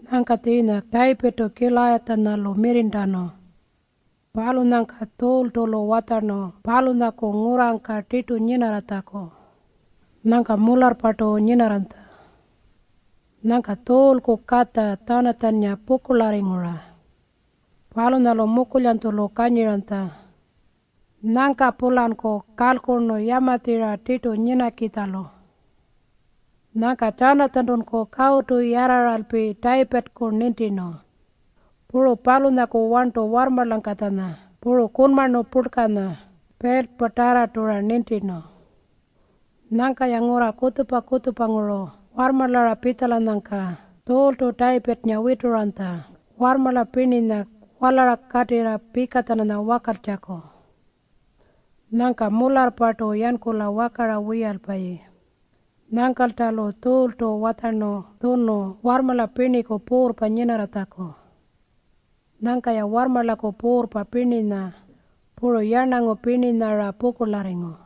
Nyangka tjiinya Tayipirrtu Kilayatjanya-lu mirrirntanu. Palunyangka Tjuultu-lu watjarnu palunyaku ngurrangka tirtu nyinarratjaku. Nyangka mularrpartu nyinarranytja. Nyangka Tjuulku katja Tjanatjannga pukurlarringu-ra. Palunyalu mukulyanytjulu kanyiranytja. Nyangka-pulanku kalkurnu yamatjirra tirtu nyinakitjalu. Nyangka Tjanatjantunku kawutu yarrarnu Tayipirrku nintirnu. Puru palunyaku warntu warrmarlangkatjanya puru kunmarnu purlkanya, piltatarrartu-ra nintirnu. Nyangka-ya ngurra kutjupa-kutjupanguru warrmarlara pitjalanyangka Tjuultu Tayipirrnga wituranytja warrmarla pirninya walara katirra pika-tjananya wakaltjaku. Nyangka mularrpartu yankula wakara wiyalpayi. Nyangkalta-lu Tjuultu watjarnu tjunu warrmarla pirniku puurrpa nyinarratjaku. Nyangka-ya warrmarlaku puurrpa pirninya puru yarnangu pirninya-ra pukurlarringu.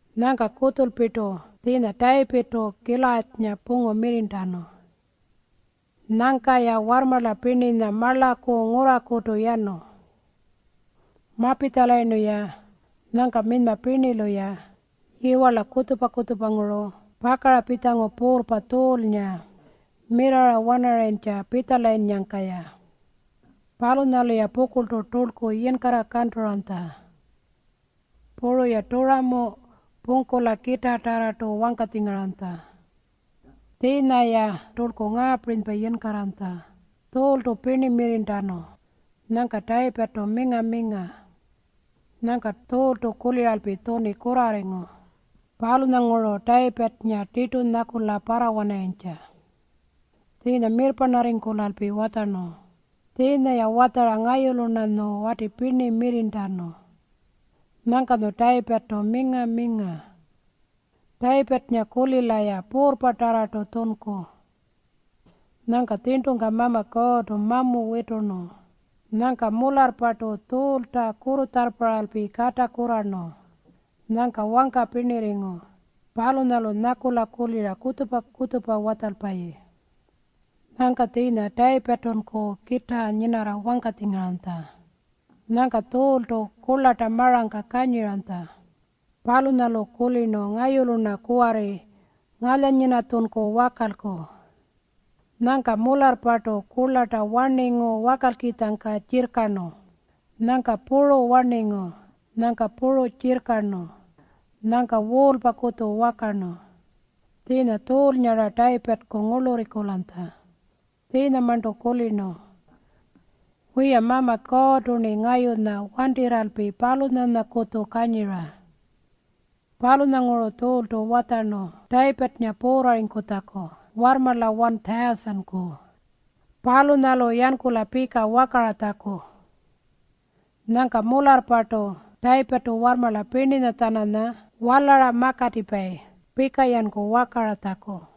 Nyangka kutjulpirtu tjiinya Tayipirrtu Kilayatjanya pungu mirrirntanu. Nyangka-ya warrmarla pirninya marlaku ngurrakutu yanu. Mapitjalayirnu-ya, nyangka minyma pirnilu-ya yiwarla kutjupa-kutjupanguru pakara pitjangu puurrpa Tjuulnga mirara wanarayintja pitjalayinnyangka-ya. Palunyalu-ya pukurltu turlku yinkarra kanturanytja. Puru-ya turamu pungkula kitaatarrartu wangkatjingaranytja. Tjiinya-ya turlku ngaapirinypa yinkarranytja, “Tjuultu pirni mirrirntanu. Nyangka Tayipirrtu minga-minga.” Nyangka Tjuultu kuliralpi tjuni kurrarringu. Palunyanguru Tayipirrnga tirtu nyakula parrawanarayintja. Tjiinya mirrparnarringkulalpi watjarnu, “Tjiinya-ya watjara ngayulu-rnanyu wati pirni mirrirntanu. Nyangkanyu Tayipirrtu minga-minga. Tayipirrnga-kulila-ya puurrpatarrartu tjunku.” Nyangka tjirntungka Mama Kuurrtu mamu witurnu. Nyangka mularrpartu Tjuulta kurrutjarrparralpi kata kurrarnu nyangka wangka pirnirringu. Palunyalu nyakula kulira kutjupa-kutjupa watjalpayi. Nyangka tjiinya Tayipirrtunku kitaa nyinarra wangkatjingaranytja. Nyangka Tjuultu kurlarta marangka kanyiranytja. Palunyalu kulirnu, “Ngayulu-rna kuwarri ngalyanyinatjunku wakalku.” Nyangka mularrpartu kurlarta warningu wakalkitjangka tjirrkarnu. Nyangka puru warningu. Nyangka puru tjirrkarnu. Nyangka wuulpakutju wakarnu. Tjiinya Tjuulnga-ra Tayipirrku ngurlurringkulanytja. Tjiinyamarntu kulirnu, “Wiya, Mama Kuurrtu-rni ngayunya wantirralpi palunyanyakutju kanyira.” Palunyanguru Tjuultu watjarnu Tayipirrnga puurrarritjaku warrmarla 1,000-ku, palunyalu yankula pika wakaratjaku. Nyangka mularrpartu Tayipirrtu warrmarla pirninya-tjananya walara makatipayi pika-yanku wakaratjaku.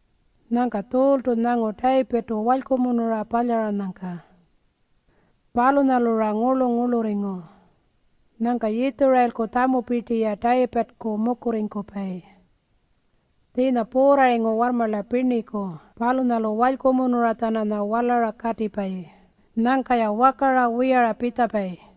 Nyangka Tjuultu nyangu Tayipirrtu walykumunura palyaranyangka. Palunyalu-ra ngurlu-ngurlurringu. Nyangka Yitjurayilku tjamupirti-ya Tayipirrku mukurringkupayi. Tjiinya puurrarringu warrmarla pirniku palunyalu walykumunura-tjananya walara katipayi. Nyangka-ya wakara wiyara pitjapayi.